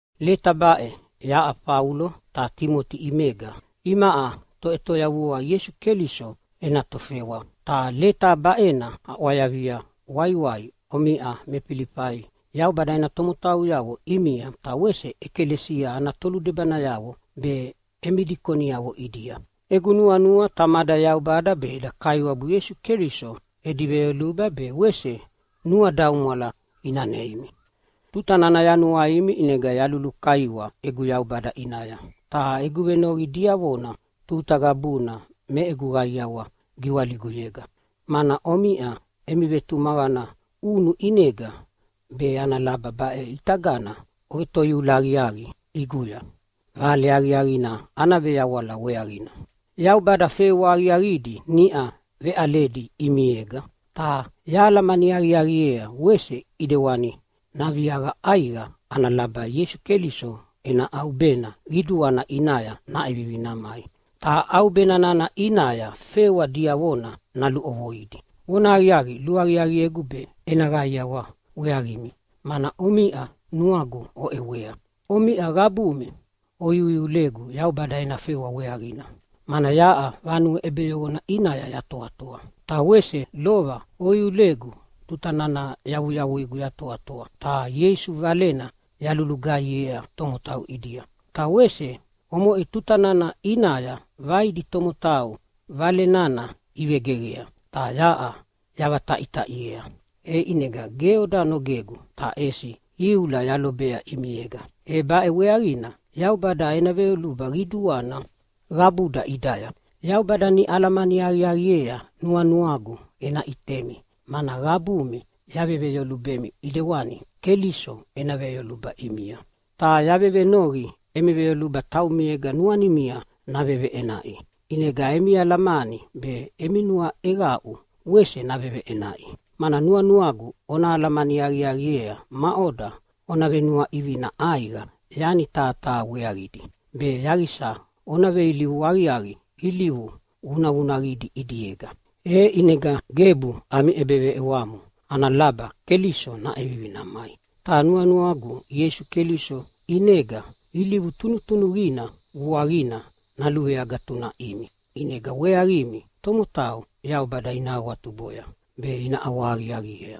Leta baʼe yaʼa Faulo ta Timoti ʼimega, imaʼa Toʼetoyavua Ieisu Keliso ena tofewa. Ta leta baʼena aʼwayavia waiwai omiʼa me Filifai Yaubada ena tomotauyavo ʼimia, ta wese ʼekalesia ana toludebanayavo be emi dikoniavo ʼidia. Egu nuanua Tamada Yaubada be eda Kaiwabu Ieisu Keliso edi veyoluba be wese nuadaumwala ina neimi. Tuta nana yanuaimi ʼinega yalulukaiwa egu Yaubada ʼinaya. Ta egu venoqi diavona tuta qabuna me egu qaiawa giwaliguya, mana omiʼa emi vetumaqana ʼunu ʼinega, be ana laba baʼe ʼitagana ovetoiula aqiaqi ʼiguya Vale Aqiaqina ana veyawala weaqina. Yaubada fewa aqiaqidi niʼa veʼaledi ʼimiega, ta yahalamani aqiaqiea wese ʼidewani naviaqa ʼaiqa ana laba Ieisu Keliso ena ʼaubena qiduana ʼinaya naʼevivi namai. Ta ʼaubena nana ʼinaya fewa diavona naluʼovoidi. Vonahaqiaqi, luaqiaqiegu be ena qaiawa weaqimi, mana omiʼa nuagu oʼewea. Omiʼa qabumi oiuiulegu Yaubada ena fewa weaqina, mana yaʼa vanue ʼebeyoqona ʼinaya yatoatoa. Ta wese lova oiulegu tuta nana yavuyavuigu yatoatoa ta Ieisu Valena yalulugaihiea tomotau ʼidia. Ta wese omoʼe tuta nana ʼinaya vaidi tomotau Vale nana ivegeqea ta yaʼa yavataʼitaʼiea, e ʼinega ge oda nogegu, ta ʼesi iula yalobea ʼimiega. E baʼe weaqina Yaubada ena veyoluba qiduana qabuda ʼidaya. Yaubada niʼa alamani aqiaqiea nuanuagu ena ʼitemi, mana qabumi yaveveyolubemi ʼidewani Keliso ena veyoluba ʼimia. Ta yavevenoqi emi veyoluba taumiega nuanimia naveveʼenaʼi, ʼinega emi alamani be emi nuaʼeqaʼu wese naveveʼenaʼi. Mana nuanuagu ona alamani aqiaqiea maʼoda ona venuaʼivina ʼaiqa yani taha taha weaqidi, be yaqisa ona veilivu aqiaqi ilivu vunavunaqidi ʼidiega, e ʼinega gebu ami ʼebeveʼewamo ana laba Keliso naʼevivi namai. Ta nuanuagu Ieisu Keliso ʼinega ilivu tunutunuqina vuaqina naluveagatunaʼimi, ʼinega weaqimi tomotau Yaubada ina awatuboya be ina ʼawahaqiaqiea.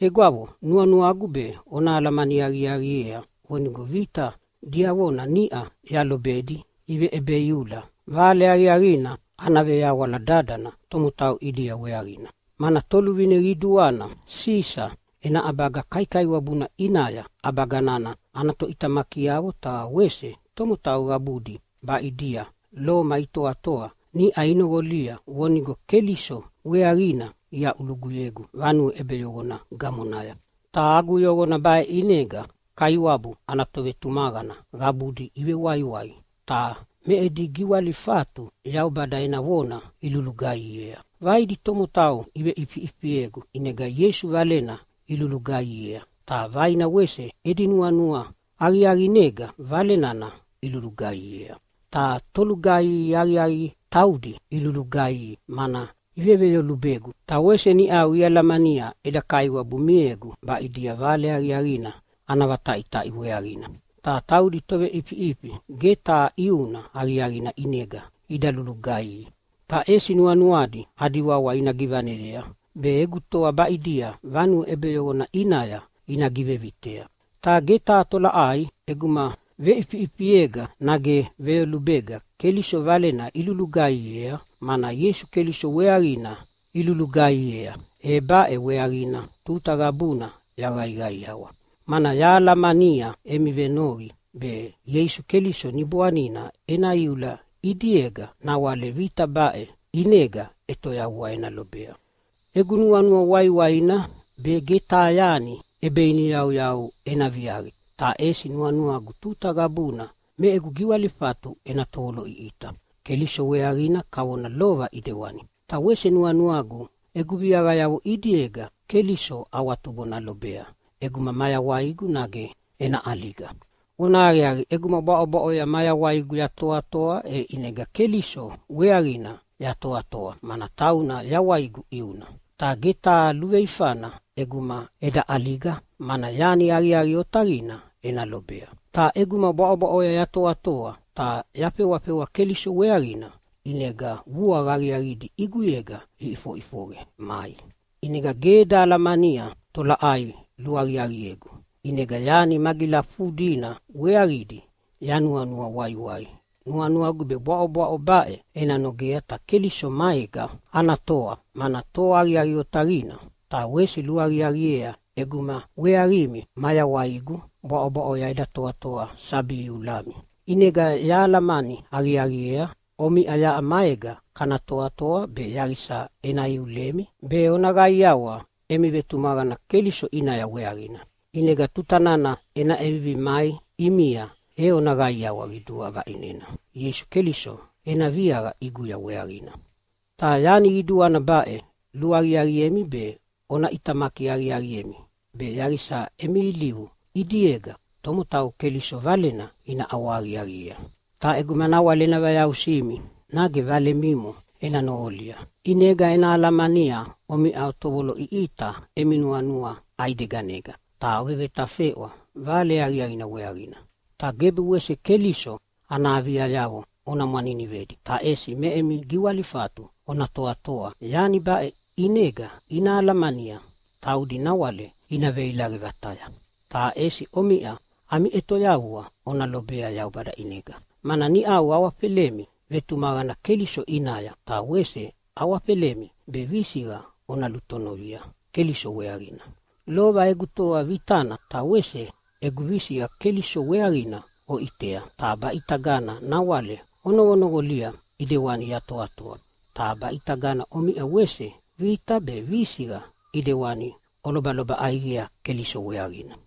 Egwavo, nuanuagu be ona alamani aqiaqiea vonigo vita diavona niʼa yalobedi iveʼebeiula Vale Aqiaqina ana veyawala dadana tomotau ʼidia weaqina. Mana toluvine qiduana Sisa ena ʼabaga kaikaiwabuna ʼinaya ʼabaga nana ana toʼitamakiavo ta wese tomotau qabudi baʼidia Loma itoatoa niʼa inoqolia vonigo Keliso weaqina iaʼuluguyegu vanue ʼebeyoqona gamonaya. Ta agu yoqona baʼe ʼinega Kaiwabu ana tovetumaqana qabudi ivewaiwai ta me edi giwalifatu Yaubada ena vona ilulugaihiea. Vaidi tomotau iveʼifiʼifiegu ʼinega Ieisu Valena ilulugaihiea, ta vaina wese edi nuanua aqiaqinega Vale nana ilulugaihiea. Ta tolugaihi aqiaqi taudi ilulugaihi mana iveveyolubegu, ta wese niʼau ialamania eda Kaiwabu miegu baʼidia Vale Aqiaqina ana vataʼitaʼi weaqina. Ta taudi toveʼifiʼifi ge taha ʼiuna aqiaqina ʼinega ida lulugaihi, ta ʼesi nuanuadi adi wawa ina givaneyea be egu toa baʼidia vanue ʼebeyoqona ʼinaya ina givevitea. Ta ge taha tolaʼai ʼeguma veʼifiʼifiega nage veyolubega Keliso Valena ilulugaihiea, mana Ieisu Keliso weaqina ilulugaihiea. E baʼe weaqina tuta qabuna yaqaiqaiawa. Mana yahalamania emi venoqi be Ieisu Keliso Niboanina ena iula ʼidiega nawale vita baʼe ʼinega ʼetoyavua ena lobea. Egu nuanua waiwaina be ge taha yani ʼebeiniyauyau ena viaqi, ta ʼesi nuanuagu tuta qabuna me egu giwalifatu ena tovoloʼiʼita Keliso weaqina kavona lova ʼidewani. Ta wese nuanuagu egu viaqayavo ʼidiega Keliso awatubo nalobea ʼeguma mayawaigu, nage ena ʼaliga. Vonahaqiaqi, ʼeguma bwaʼobwaʼoya mayawaigu yatoatoa, e ʼinega Keliso weaqina yatoatoa, mana tauna yawaigu ʼiuna. Ta ge taha luveifana ʼeguma eda ʼaliga, mana yani aqiaqi otaqina ena lobea. Ta ʼeguma bwaʼobwaʼoya yatoatoa ta yafewafewa Keliso weaqina ʼinega vuaqa aqiaqidi ʼiguyega iʼifoʼifoqe mai. ʼInega ge eda alamania tolaʼai luaqiaqiegu. ʼInega yani magilafudina weaqidi yanuanua waiwai. Nuanuagu be bwaʼobwaʼo baʼe ena nogea ta Keliso maega ana toa, mana toa aqiaqi otaqina. Ta wese luaqiaqiea ʼeguma weaqimi mayawaigu bwaʼobwaʼoya eda toatoa sabi iulami. ʼInega yahalamani aqiaqiea omiʼa yaʼa maega kana toatoa be yaqisa ena iulemi be ona qaiawa emi vetumaqana Keliso ʼinaya weaqina. ʼInega tuta nana ena ʼevivi mai ʼimia e ona qaiawa qidua vaʼinena Ieisu Keliso ena viaqa ʼiguya weaqina. Ta yani qiduana baʼe, luaqiaqiemi be ona ʼitamaki aqiaqiemi be yaqisa emi ilivu ʼidiega tomotau Keliso Valena ina ʼawahaqiaqiei. Ta ʼeguma nawale ena vayausimi nage vale mimo ena noqolia, ʼinega ena alamania omiʼa otovoloʼiʼita emi nuanua ʼaideganega ta ovevetafeʼwa Vale Aqiaqina weaqina. Ta gebu wese Keliso ana aviayavo ona mwaninivedi, ta ʼesi me emi giwalifatu ona toatoa. Yani baʼe ʼinega ina alamania taudi nawale ina veilaqe vataya. Ta ʼesi omiʼa ami ʼetoyavua ona lobea Yaubada ʼinega, mana niʼau awafelemi vetumaqana Keliso ʼinaya, ta wese awafelemi be visiqa ona lutonovia Keliso weaqina. Lova egu toa vitana ta wese egu visiqa Keliso weaqina oʼitea, ta baʼitagana nawale onoqonoqolia ʼidewani yatoatoa. Ta baʼitagana omiʼa wese vita be visiqa ʼidewana olobaloba ʼaiqea Keliso weaqina.